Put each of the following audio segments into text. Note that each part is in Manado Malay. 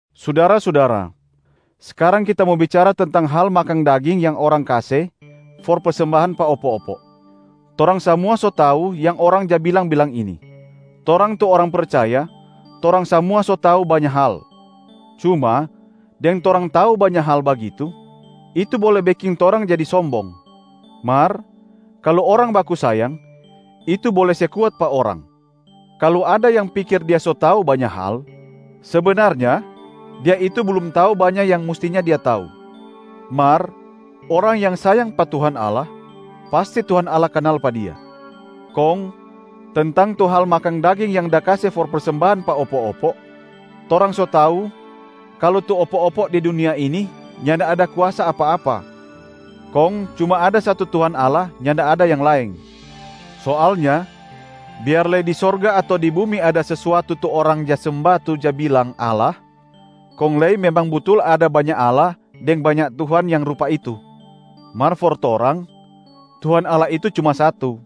Sudara-sudara, skarang kita mo bicara tentang hal makang daging yang orang kase for persembahan pa opo-opo. Torang samua so tau yang orang ja bilang-bilang ini, “Torang tu orang percaya, torang samua so tau banya hal.” Cuma deng torang tau banya hal bagitu, itu bole beking torang jadi sombong. Mar kalu orang baku sayang, itu bole se kuat pa orang. Kalu ada yang pikir dia so tau banya hal, sebenarnya dia itu blum tau banya yang mustinya dia tau. Mar orang yang sayang pa Tuhan Allah, pasti Tuhan Allah kanal pa dia. Kong tentang tu hal makang daging yang da kase for persembahan pa opo-opo, torang so tau kalu tu opo-opo di dunia ini nyanda ada kuasa apa-apa, kong cuma ada satu Tuhan Allah, nyanda ada yang laeng. Soalnya biar lei di sorga ato di bumi ada sesuatu tu orang ja semba tu ja bilang “allah”, kong lei memang butul ada banya “allah” deng banya “tuhan” yang rupa itu, mar for torang, Tuhan Allah itu cuma satu,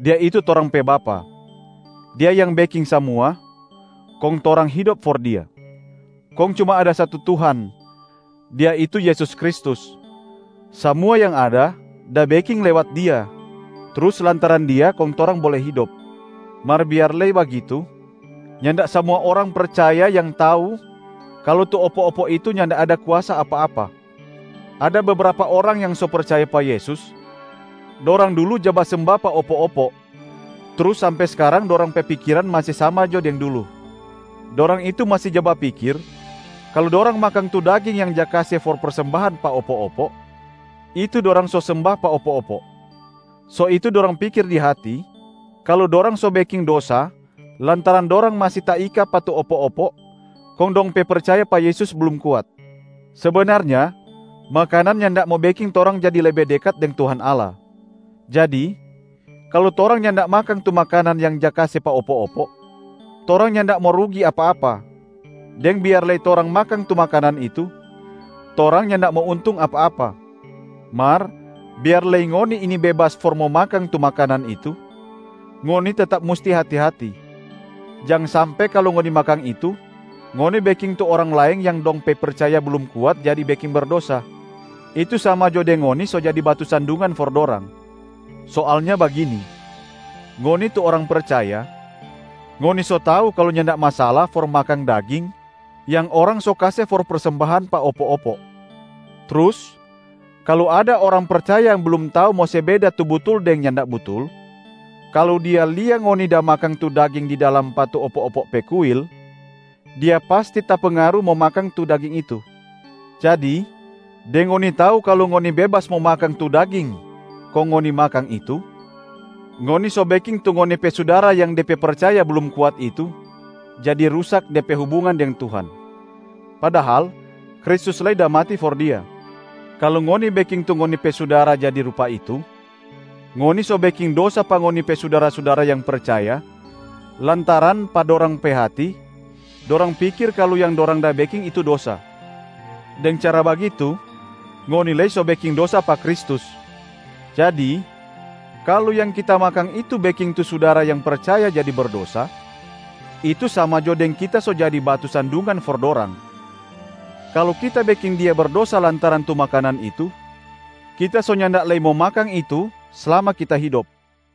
Dia itu torang pe Bapa. Dia yang beking samua, kong torang hidop for Dia. Kong cuma ada satu Tuhan, Dia itu Yesus Kristus. Samua yang ada da beking lewat Dia, trus lantaran Dia kong torang bole hidop. Mar biar lei bagitu, nyanda samua orang percaya yang tau kalu tu opo-opo itu nyanda ada kuasa apa-apa. Ada bebrapa orang yang so percaya pa Yesus, dorang dulu ja basemba pa opo-opo, trus sampe skarang dorang pe pikiran masi sama jo deng dulu. Dorang itu masi ja bapikir kalu dorang makang tu daging yang ja kase for persembahan pa opo-opo, itu dorang so semba pa opo-opo. So itu dorang pikir di hati kalu dorang so beking dosa lantaran dorang masi taika pa tu opo-opo kong dong pe percaya pa Yesus blum kuat. Sebenarnya makanan nyanda mo beking torang jadi lebe dekat deng Tuhan Allah. Jadi kalu torang nyanda makang tu makanan yang ja kase pa opo-opo, torang nyanda mo rugi apa-apa, deng biar lei torang makang tu makanan itu, torang nyanda mo untung apa-apa. Mar biar lei ngoni ini bebas for mo makang tu makanan itu, ngoni tetap musti hati-hati, jang sampe kalu ngoni makang itu, ngoni beking tu orang laeng yang dong pe percaya blum kuat jadi beking dosa, itu sama jo deng ngoni so jadi batu sandungan for dorang. Soalnya bagini: ngoni tu orang percaya, ngoni so tau kalu nyanda masala for makang daging yang orang so kase for persembahan pa opo-opo. Trus kalu ada orang percaya yang blum tau mo se beda tu butul deng nyanda butul, kalu dia lia ngoni da makang tu daging di dalam pa tu opo-opo pe kuil, dia pasti tapengaru mo makang tu daging itu. Jadi deng ngoni tau kalu ngoni bebas mo makang tu daging kong ngoni makang itu, ngoni so beking tu ngoni pe sudara yang de pe percaya blum kuat itu jadi rusak de pe hubungan deng Tuhan. Padahal Kristus lei da mati for dia. Kalu ngoni beking tu ngoni pe sudara jadi rupa itu, ngoni so beking dosa pa ngoni pe sudara-sudara yang percaya lantaran pa dorang pe hati, dorang pikir kalu yang dorang da beking itu dosa. Deng cara bagitu, ngoni lei so beking dosa pa Kristus. Jadi kalu yang kita makang itu beking tu sudara yang percaya jadi berdosa, itu sama jo deng kita so jadi batu sandungan for dorang. Kalu kita beking dia berdosa lantaran tu makanan itu, kita so nyanda lei mo makang itu slama kita hidop.